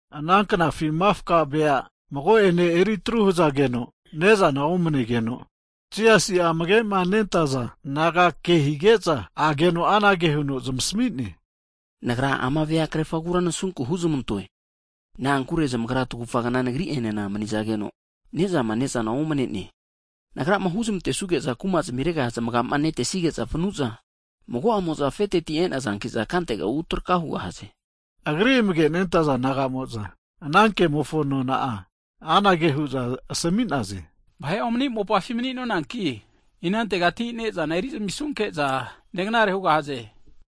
Ana knafi mafka vea mago'ene eritru hzageno, ne'zana omanegeno, Jisasi'a amage'ma nentaza disaipol naga ke hige'za ageno anage huno zamasmi'ne. Nagra ama vea krerfagura nasunku huzmantoe. Na'ankure zamagra tagufa kna nagri'enena mani'zageno, ne'zama ne'zana omane'ne. Nagrama huzmantesuge'za kuma zimirega zmaga'ma netesige'za vanu'za, mago'amo'za afeteti e'nazankiza kantega utraka hugahaze. Agri amage'ma nentza disaipol naga'mo'za anankemofo nona'a anage hu'za asami'naze, vahe omani mopafi mani'nonanki inantegati' ne'zana erizamisunke'za neganare hugahaze?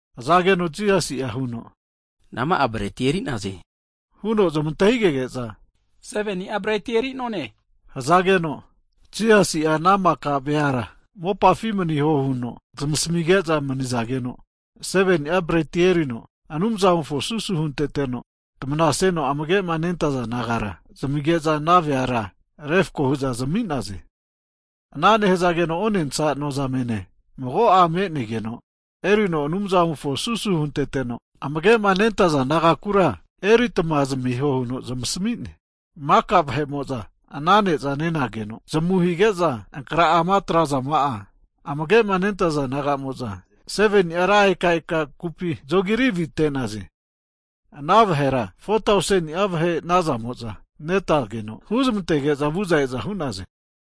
Hzageno Jisasi'a huno nama'a breti eri'naze? huno zmantahigege'za, 7ni'a breti eri'none, hzageno, Jisasi'a ana maka veara mopafi maniho huno zmasamige'za manizageno, 7ni'a breti erino Anumzamofo susu hunteteno, tamanasino amage'ma nentaza disaipol nagara zmige'za ana veara refko hu'za zami'naze. Ana nehzageno onensa nozamene mago'a me'negeno erino Anumzamofo susu hunteteno, amagema nentazana disaipol nagakura eritma zamiho huno zamasmi'ne. Maka vahe'mo'za ana ne'za nenageno zamu hige'za ankra'ama atrazama'a, amagema nentaza disaipol nagamo'za 7ni'a ra eka eka kupi zogiri avite'naze. Ana vahera 4tauseni'a vahe nazamo'za netageno, huzmantege'za vu'za e'za hu'naze.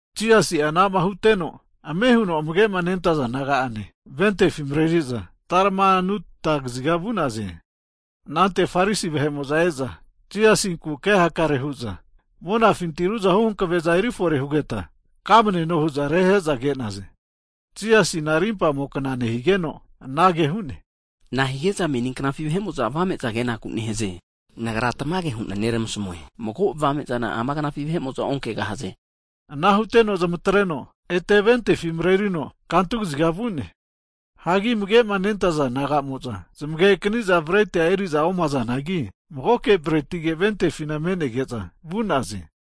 Jisasi'a anama huteno, ame huno amage'ma nentaza disaipol naga'ane ventefi mareri'za Talmanuta kaziga vu'naze. Anante Farisi vahemo'za e'za Jisasinku ke hakare hu'za, monafinti ruzahu hankave'za erifore hugeta kamneno huza rehe'za ke'naze. Jisasina rimpamo kna nehigeno anage hu'ne, Na'a hige'za meni knafi vahe'mo'za avame'za kenakura nahaze? Nagra tamage hu'na neramasamue, mago avame'zana ama knafi vahe'mo'za onkegahaze. Ana huteno zamatreno ete ventefi marerino kantu kaziga vu'ne. Hagi amage'ma nentaza disaipol naga'mo'za zmagekani'za bretia eri'za omazanagi, magoke bretige ventefina me'nege'za vu'naze.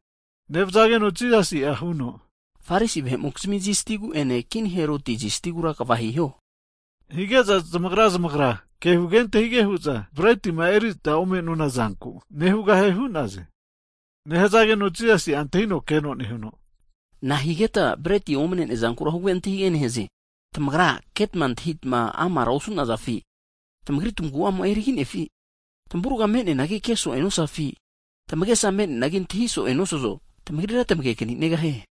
Nevzageno Jisasi'a huno, Farisi vahe'mokizmi zistigu'ene kini Heroti zistigura kva hiho. Hige'za zmagra zmagra ke huge antahige hu'za bretima erita ome'nonazanku nehugahie hu'naze. Nehazageno Jisasi'a antahino keno nehuno, nahigeta breti omane'nea zankura huge antahige nehaze? Tamagra ketma antahi amara osu'nazafi? Tamagri tmagu'amo'a eriginefi? Tamavurga me'neana ke so'e nosazafi? Tamagesama me'neana antahi so'e nosazo? Tmagrira tamage'kaninegahie.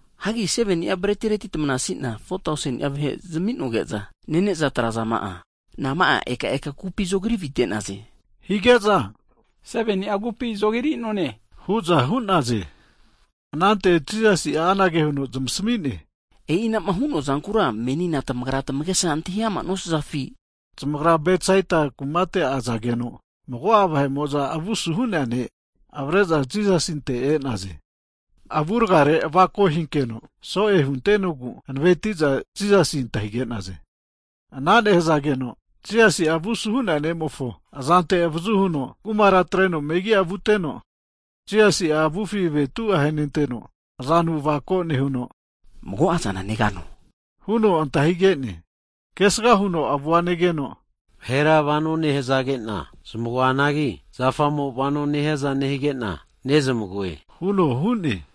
Hagi 7ni'a bretireti tamnasi'na 4tauseni'a vahe zami'noge'za nene'za atrazama'a, nama'a eka eka kupi zogiri avite'naze? Hige'za 7ni'a kupi zogiri'none hu'za hu'naze. Anante Jisasi'a anage huno zmasami'ne, e'ina'ma hu'noazankura menina tamagra tamagesa antahi'ama nosazafi? Zamagra Bedsaita kumate azageno, mago'a vahe'mo'za avusu hu'nea ne' avare'za Jisasinte e'naze. Avurgare avako hinkeno so'e huntenogu hanaveti'za Jisasi antahige'naze. Ana nehzageno, Jisasi'a avusu hu'nea ne'mofo azante avazu huno kumara atreno megi'a vuteno, Jisasi'a avufi avetu ahenenteno, azanu avako nehuno, mago'azana negano? Huno antahigene. Kesga huno avua negeno, vahera vano nehazagena zmagoanagi, zafamo vano nehiaza nehige'na nezmagoe huno hu'ne.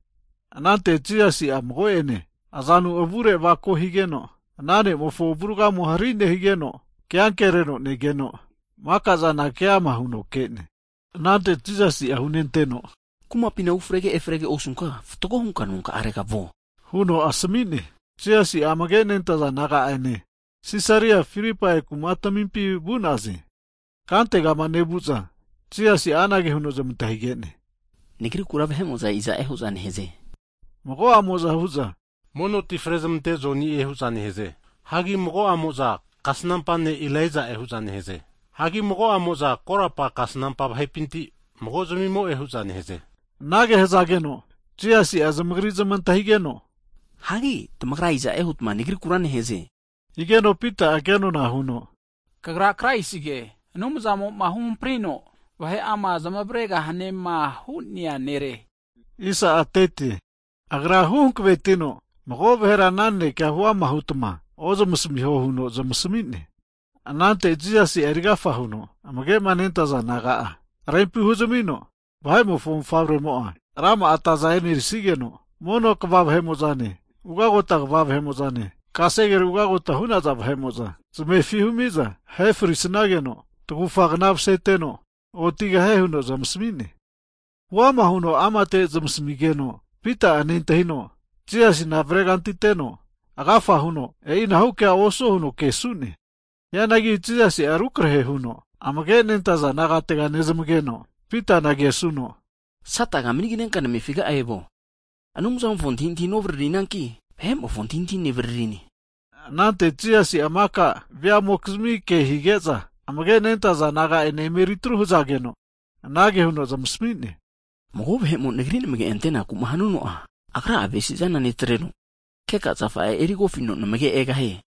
Anante Jisasi'a mago'ene azanu avurgare avako higeno, ana ne'mofo avurgamo'a hari higeno, ke ankereno negeno maka'zana keama huno ke'ne. Anante Jisasi'a hunenteno, kumapina ufrege efrege osunka, fatgo hunka nonkarega vuo huno asami'ne. Jisasi'a amage nentaza disaipol naga'ane Sisaria Filipai kumatamimpi vu'naze. Kantegama nevu'za Jisasi'a anage huno zmantahige'ne, Nagrikura vahe'mo'za iza'e hu'za neheze? Mago'amo'za, hu'za mono ti frezamante'nea Joni'e hu'za nehze. Hagi mago'a mo'za, kasnampa ne' Ilaija'e hu'za nehze. Hagi mago'amo'za korapa kasnampa vahepinti mago'zmimo'e hu'za neheze. Anage hzageno Jisasi'a zamagri zmantahigeno, hagi tamagra iza'e hutma Nagrikura neheze? Higeno Pita'a kenona huno, kagra Kraisige, Anumzamo'ma huhamprino vahe'ama zmavregahanema hu'nea nere hu'ne. Agra hu hankavetino mago vahera ana naneke huama hutma ozmasmiho huno zamasmi'ne. Anante Jisasi'a erigafa huno amage'ma nentaza disaipol naga'a rempi huzamino, Vahe'mofo Mofavremo'a rama'a ata e'nerisigeno, mono kva vahe'mo'zane, ugagota kva vahe'mo'zane, kasegere ugagota hu'naza vahe'mo'za zmefi humiza ahefrisageno, tagufagna maseteno otigahie huno zmasami'ne. Huama huno amate zmasamigeno, Pita'a nentahino Jisasina avaregantiteno, agafa huno e'inahu kea osuo huno kesu'ne. Hianagi Jisasi'a rukrahe huno, amage nentaza disaipol nagatega nezmageno Pitana kesuno, Sataga manignenka namefiga'a evuo, Anumzamofo antahintahi novaririnanki, vahe'mofo antahintahi nevaririne. Anante Jisasi'a maka veamokizmi ke hige'za, amage'ma nentaza disaipol naga ene emetru hazageno, anage huno zmasami'ne, mago vahe'mo nagri namage'ma antenaku'ma hanuno'a, agra'a avesi'zana netreno, keka zafa'a erigofino namage egahie.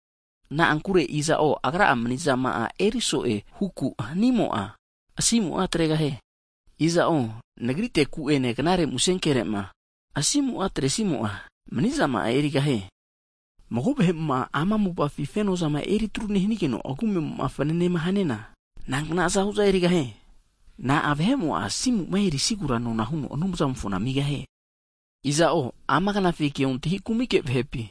Na'ankure iza'o, agra'a manizama'a eri so'e huku hanimo'a, asimu'a atregahie. Iza'o nagriteku'ene knare musenkere'ma asimu'a atresimo'a, manizama'a erigahie. Mago vahe'mo'ma ama mopafi fenoza eri atruma nehanigeno, agu amema'a fnanema haniana, nankna aza hu'za erigahie? Na'a vahe'mo'a asimuma erisigura nona'a huno Anumzamofona amigahie? Iza'o ama knafi keontahi kumike vahepi,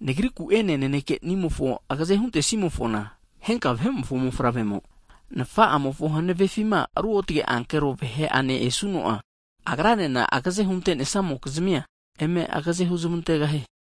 Nagriku'ene Nanekenimofo agaze huntesimofona, henka Vahe'mofo Mofavremo Nfa'amofo hanavefima routge ankero vahe'ane esuno'a, Agranena zamagaze hunte'nesamokizmia, eme agaze huzmantegahie.